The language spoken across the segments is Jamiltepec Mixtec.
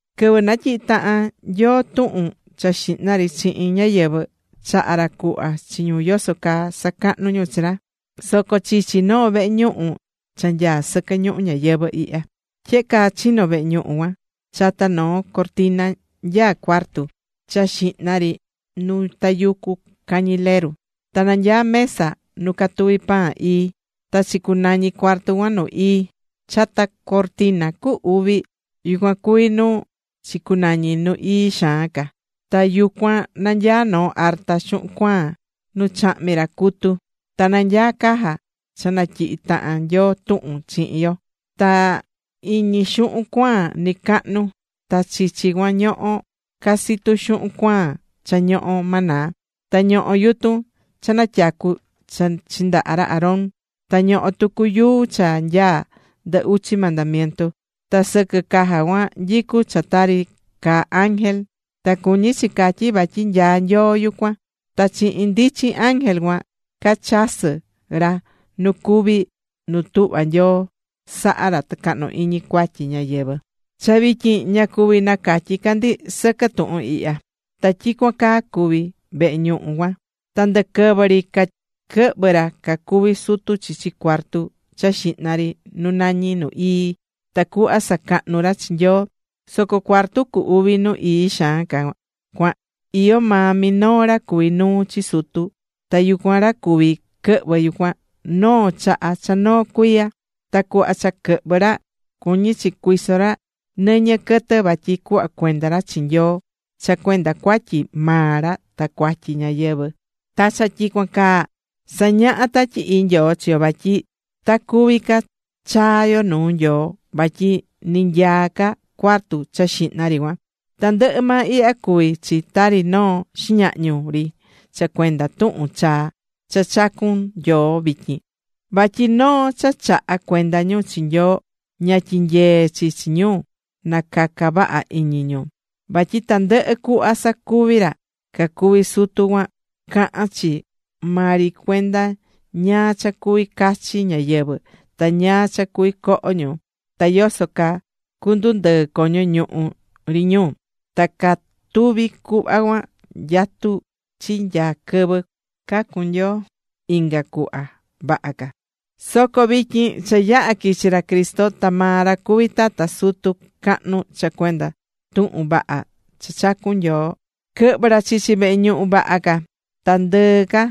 Quɨvɨ natyihi̱ tahan Nyoo tuhun cha xihna ri chihin ñáyɨvɨ, chaha̱ ra cuhva chi ñu yoso caa sacahnu ñu chi ra, soco chichi noo vehe ñuhu cha nyaá sɨquɨ ñuhu ñayɨvɨ̱ ihya. Tyehe caa chino̱ vehe ñuhu cuan: Chata noo cortina nyaá cuartu cha xihna ri nu tayucú cañileru, ta nanyaá mesa nu catuvi̱ pan ii. Ta chicunañi̱ cuartu cuan Nu Ii. Chata cortina cu uvi, yucuan cuvi̱ nu chicunañi̱ Nu Ii Xaan Ca. Ta yucuan nanyaá noo arta xuhun cuaan nu chahmi̱ ra cutu. Ta nanyaá caja, cha natyihi̱ tahan Nyoo tuhun chihin yo, ta iñi xuhun cuaan nɨcacahnu. Ta chichi cuan ñoho̱ casitu xuhun cuaan cha ñoho̱ maná. Ta ñoho̱ yutun cha natyacu̱ cha chindaha̱ ra Aarón. Ta ñoho̱ tucu yuu cha nyaá ndɨ uchi mandamientu. Ta sɨquɨ caja cuan nyicú cha tari caa ángel, ta cuñí chi catyí vatyi nyaá Nyoo yucuan. Ta chihin ndichin ángel cuan cachasɨ́ ra nu cuví nu tuhva̱ Nyoo saha̱ ra tɨcahnu iñi cuatyi ñáyɨvɨ. Cha vityin ña cuví nacatyí ca ndi sɨquɨ tuhun ihya. Ta tyicuan caa cuvi̱ vehe ñuhu cuan. Ta ndɨquɨvɨ ri caquɨhvɨ̱ ra cacuví sutu chichi cuartu cha xihna ri nu nañí Nu Ii, tacuhva sacahnu ra chi Nyoo. Soco cuartu cu uvi Nu Ii Xaan Ca cuan iyó maa minoo ra cuví nuu chi sutu, ta yucuan ra cuví quɨhvɨ yucuan, noo chaha cha noo cuiya. Ta cuhva cha quɨhvɨ̱ ra, cuñí chi cuiso ra nɨñɨ quɨtɨ vatyi cuhva cuenda ra chi Nyoo cha cuenda cuatyi maa ra ta cuatyi ñáyɨvɨ. Ta cha tyicuan caa sañahá Tatyi Ii Nyoo chi yo vatyi, ta cuvi ca chaa yo nuu Nyoo vatyi ni nyaá ca cuartu cha xihna ri cuan. Tandɨhɨ maa ihya cuví chi tari noo xiñahñu ri cha cuenda tuhun chaa cha chacu̱n Nyoo vityin: vatyi noo cha chaha̱ cuenda ñu chi Nyoo ña tyiñyee̱ chi chi ñu na caca vaha iñi ñu. Vatyi tandɨhɨ cuhva sacuvi̱ ra cacuvi̱ sutu cuan cahán chi maa ri cuenda ñáá cha cuví cachi ñáyɨvɨ, ta ñáá cha cuví coho ñu, ta yoso caa cundundɨɨ coño ñuhu ri ñu. Ta catuvi̱ cuhva cuan, nyatu̱ chi nya quɨvɨ cacun Nyoo inga cuhva vaha ca. Soco vityin cha yaha̱ quichi̱ ra Cristo ta maa ra cuví tata sutu cahnu cha cuenda tuhun vaha ca cha chacu̱n Nyoo. Quɨhvɨ̱ ra chichi vehe ñuhu vaha ca, ta ndɨɨ ca,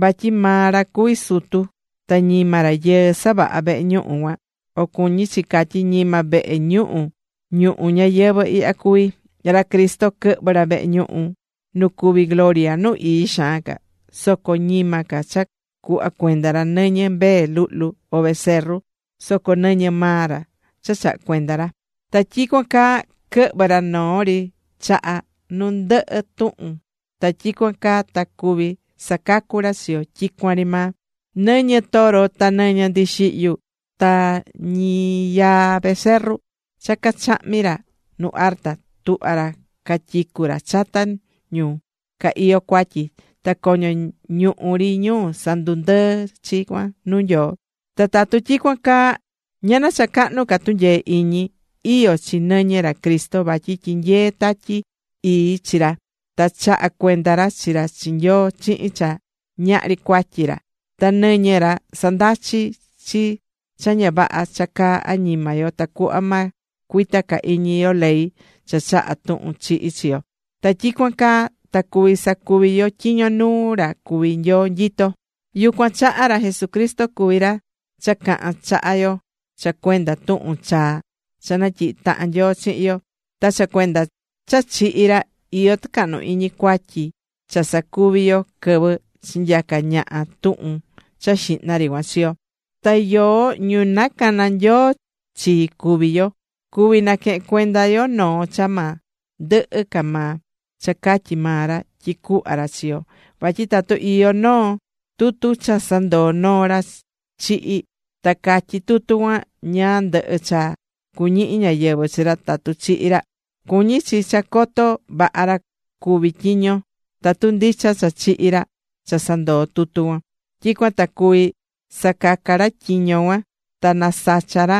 vatyi maa ra cuví sutu. Ta ñima rayɨɨ savaha̱ vehe ñuhu cuan o cuñí chi catyí, ñima vehe ñuhu ñuhu ñayɨvɨ̱ ihya cuví. Ra Cristo quɨhvɨ̱ ra vehe ñuhu nu cuví gloria Nu Ii Xaan Ca. Soco ñima ca cha cuhva cuenda ra nɨñɨ mbee luhlu, o becerro, soco nɨñɨ maa ra chaha̱ cuenda ra. Ta tyicuan caa quɨhvɨ̱ ra noo ri chaha nu ndɨhɨ tuhun, ta tyicuan caa ta cuví sacacu ra chi yo tyicuan ri maa. Nɨñɨ toro, ta nɨñɨ ndixihyu, ta ñiyaa becerro cha cachahmi̱ ra nu arta, tuhva̱ ra catyicu̱ ra chata ñu ca iyó cuatyi, ta coño ñuhu ri ñu sandundɨɨ̱ chi cuan nuu Nyoo. Ta tatu tyicuan caa, ¡Ñana cha cahnu ca tunyee iñi iyó chi nɨñɨ ra Cristo! Vatyi tyinyee̱ Tatyi Ii chi ra ta chaha̱ cuenda ra chi ra chi Nyoo chihin cha ñahri cuatyi ra. Ta nɨñɨ ra sandachí chi cha ña vaha cha caá añima yo tacuhva ma cuita ca iñi yo ley cha chaha̱ tuhun chihi chi yo, ta tyicuan caa ta cuví sacuvi yo tyiño nuu ra cuví Nyoo nyitó. Yucuan chaha ra Jesucristo cuví ra cha cahán chaha yo cha cuenda tuhun chaa cha natyihi̱ tahan Nyoo chihin yo. Ta cha cuenda cha chihi̱ ra, iyó tɨcahnu iñi cuatyi cha sacuvi̱ yo quɨvɨ chinyaca̱ ñaha tuhun cha xihna ri cuan chi yo. Ta yoó, ñu nacana̱ Nyoo chi cuví yo, cuví naquehen cuenda yo noo cha ma ndɨhɨ ca maa, cha catyi̱ maa ra tyi cuhva ra chi yo. Vatyi tatu iyó noo tutu cha sandoo̱ noo ra chihi, ta catyí tutu cuan ñáá ndɨhɨ cha cuñihi ñáyɨvɨ chi ra tatu chihi ra; cuñí chi cha coto vaha ra cuví tyiño tatu ndicha cha chihi̱ ra cha sandoo̱ tutu cuan; tyicuan ta cuví sacaca ra tyiño cuan ta nasacha ra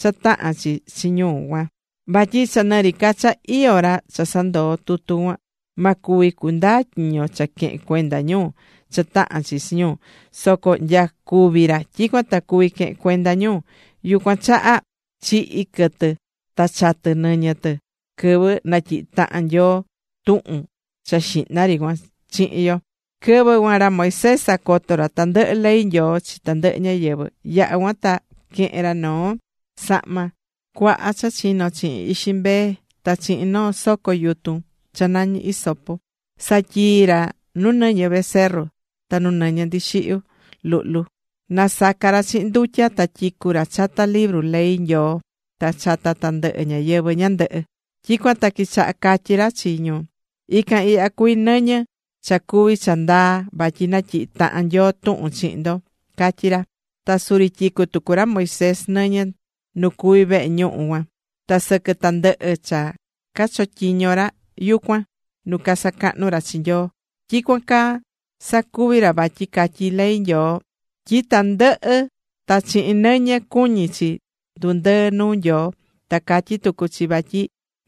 cha tahán chi chi ñu cuan. Vatyi cha nɨri ca cha iyó ra cha sandoó tutu cuan, ma cuvi cundaa tyiño cha quehen cuenda ñu cha tahán chi chi ñu, soco nya cúvi ra, tyicuan ta cuví quehen cuenda ñu. Yucuan chaha chihi̱ quɨtɨ ta chatɨ̱ nɨñɨ tɨ quɨvɨ natyihi̱ tahan Nyoo tuhun cha xihna ri cuan chihin yo. Quɨvɨ cuan, ra Moisés sacoto̱ ra tandɨhɨ ley Nyoo chi tandɨhɨ ñáyɨvɨ. Yaha̱ cuan ta quehe̱n ra noo sahma cuaha cha chino̱ chihin ixi mbee ta chihin noo soco yutun cha nañí hisopo, satyii̱ ra nu nɨñɨ becerro ta nu nɨñɨ ndixihyu luhlu, nasaca̱ ra chihin ndutya, ta tyicu̱ ra chata libru ley Nyoo ta chata tandɨhɨ ñáyɨvɨ ñandɨhɨ. Tyicuan ta quichaha catyí ra chi ñu: “Ican ihya cuví nɨñɨ cha cuví cha ndaa vatyi natyihi̱ tahan Nyoo tuhun chihin ndo”, catyí ra. Ta suri tyicu̱ tucu ra Moisés nɨñɨ nu cuví vehe ñuhu cuan, ta sɨquɨ tandɨhɨ cha cachotyiñó ra yucuan nu casacahnú ra chi Nyoo. Tyicuan caa sacuvi̱ ra vatyi catyí ley Nyoo tyi tandɨhɨ ta chihin nɨñɨ, cuñí chi ndundɨɨ nuu Nyoo. Ta catyí tucu chi vatyi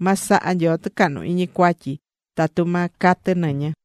ma saha Nyoo tɨcahnu iñi cuatyi tatu ma catɨ nɨñɨ.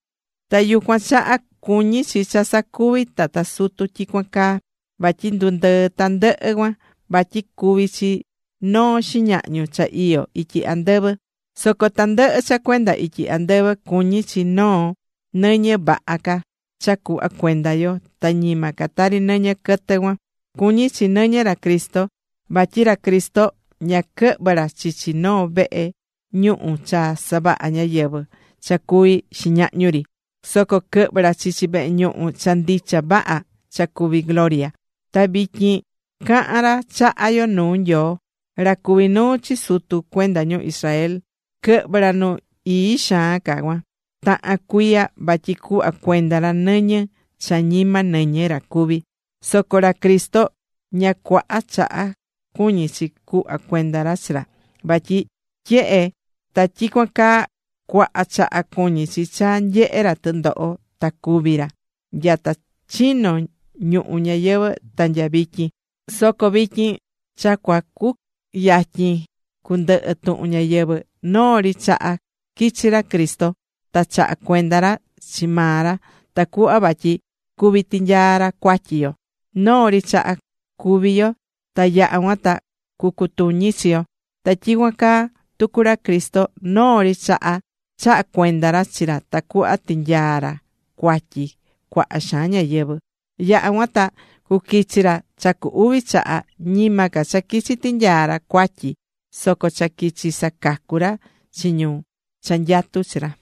Ta yucuan chaha cuñi̱ chi cha sacuvi̱ tata sutu tyicuan caa, vatyi ndundɨɨ tandɨhɨ cuan, vatyi cuví chi noo xiñahñu cha iyó ityi andɨvɨ. Soco tandɨhɨ cha cuenda ityi andɨvɨ, cuñí chi noo nɨñɨ vaha ca cha cuhva cuenda yo, ta ñima ca tari nɨñɨ quɨtɨ cuan. Cuñí chi nɨñɨ ra Cristo. Vatyi ra Cristo ña quɨhvɨ̱ ra chichi noo vehe ñuhu cha savaha̱ ñáyɨvɨ cha cuví xiñahñu ri. Soco quɨhvɨ̱ ra chichi vehe ñuhu cha ndicha vaha cha cuví gloria. Ta vityin cahán ra chaha yo nuu Nyoo. Ra cuví nuu chi sutu cuenda ñu Israel quɨhvɨ̱ ra Nu Ii Xaan Ca cuan tahan cuiya vatyi cuhva cuenda ra nɨñɨ cha ñima nɨñɨ ra cuví. Soco ra Cristo, ña cuaha chaha cuñí chi cuhva cuenda ra chi ra. Vatyi tyehe ta tyicuan caa, cuaha chaha cuñí chi cha nyehe ra tɨndoho ta cúvi ra nyata chino̱ ñuhu ñayɨvɨ̱ ta nya vityin. Soco vityin cha cua cuyatyin cundɨhɨ tuhun ñayɨvɨ̱, noo ri chaha quichi̱ ra Cristo, ta chaha̱ cuenda ra chi maa ra tacuhva vatyi cuví tinyaa ra cuatyi yo. Noo ri chaha, cúvi yo ta yaha cuan ta cucutuñi chi yo. Ta tyicuan caa tucu ra Cristo, noo ri chaha, chaha̱ cuenda ra chi ra tacuhva tinyaa ra cuatyi cuaha xaan ñáyɨvɨ. Yaha̱ cuan ta cuquichi ra cha cu uvi chaha, ñima ca cha quichi tinyaa ra cuatyi, soco cha quichi sacacu ra chi ñu cha nyatú chi ra.